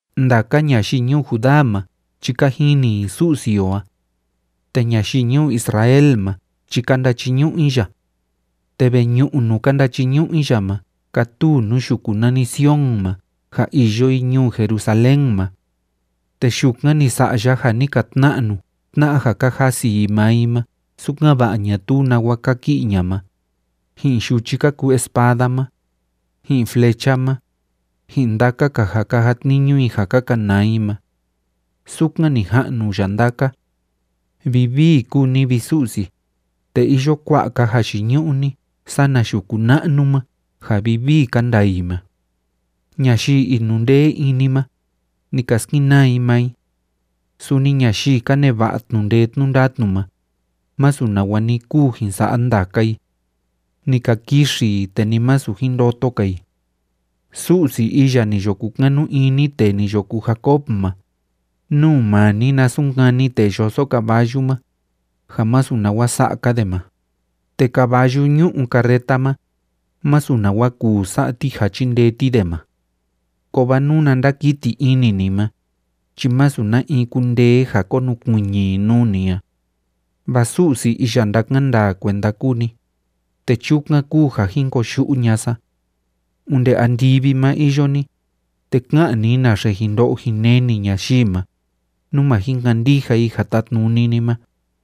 Ndaka ñayii ñuu Judá ma chi ka jini i Su'si o a. Te ñayii ñuu Israel ma chi ka ndachiñu'u i ya. Te veñu'u nuu ka ndachiñu'u i ya ma kátuu nuu yuku nani Sion ma ja iyo i ñuu Jerusalén ma. Te yukan ni sa'a ya ja ni ka tna'nu tna'a ja ka jasi i maa i ma sukan‑va'a ñatuu nawa kaki'i ña'a ma, ji'in yuchi ka kuu espada ma, ji'in flecha ma, ji'in ndaka‑ka ja ka jatniñu i ja ka kanaa i ma. Sukan ni ja'nu ya ndaka. Vivii kúu ni, vi Su'si, te iyo kua'a‑ka jayiñu'u ni sana yuku na'nu ma ja vivii ka ndaa i ma. Ñayii inundee ini ma, ni ka skenaa i maa i. Suni ñayii ka neva'a tnu'u ndee tnu'u ndatnu ma, masu nawa ni kuu jin sa'a ndaka i. Ni ka kixi i, te ni masu jin ndoto‑ka i. Su'si iya ni yo kukanu ini tee ni yo kuu Jacob ma, nú maa ni na sunkani tee yoso caballu ma ja masu nawa sa'a‑ka de ma, te caballu ñú'u carreta ma, masu nawa kuu sa'a ti ja chíndee ti de ma. Kovaa nuna ndákiti ini ni ma, chi masu na in kundee ja konukuiñi i nuu ni a. Vaa Su'si iya ndákan kuenda kúu ni, te chukan kúu ja jin koyu'u ña'a sa. Onde andivi ma iyo ni, te ká'an ni naxe jin ndo'o jin neni ñayii ma, nú ma jin kandija i ja tátnuni ni ma.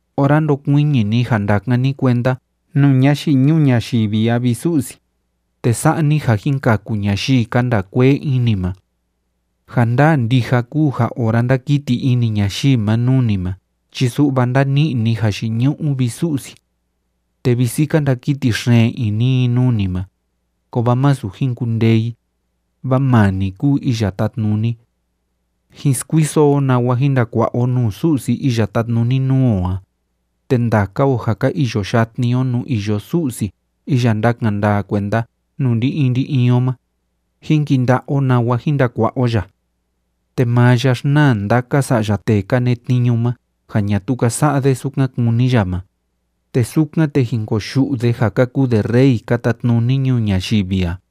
ora ndokuiñi ni ja ndakan ni kuenda nuu ñayii ñuu ñayivi a, vi Su'si, te sa'a ni ja jin kaku ñayii ka ndaa kuee ini ma. Ja ndaa ndija kúu ja ora ndákiti ini ñayii ma nuu ni ma chi su'va ndáni'i ni jayiñu'u, vi Su'si. Te visi ka ndakiti xeen ini i nuu ni ma, kovaa másu jin kundee i, vaa maa ni kúu Iya Tátnuni. Jín skuiso o nawa jín ndakua'a o nuu Su'si iya tátnuni nuu o a, te ndaka o ja ka iyo yatni o nuu iyo Su'si iya ndakan ndaa kuenda nuu ndi‑in ndi‑in o ma, jín kinda'a o nawa jin ndakua'a o ya. Te maa ya xnaa ndaka sa'ya tee ka netniñu ma ja ñatuu ka sa'a de sukan kúni ya ma, te sukan, te jin koyu'u de ja ka kuu de rey ka tatnuni ñuu ñayivi a.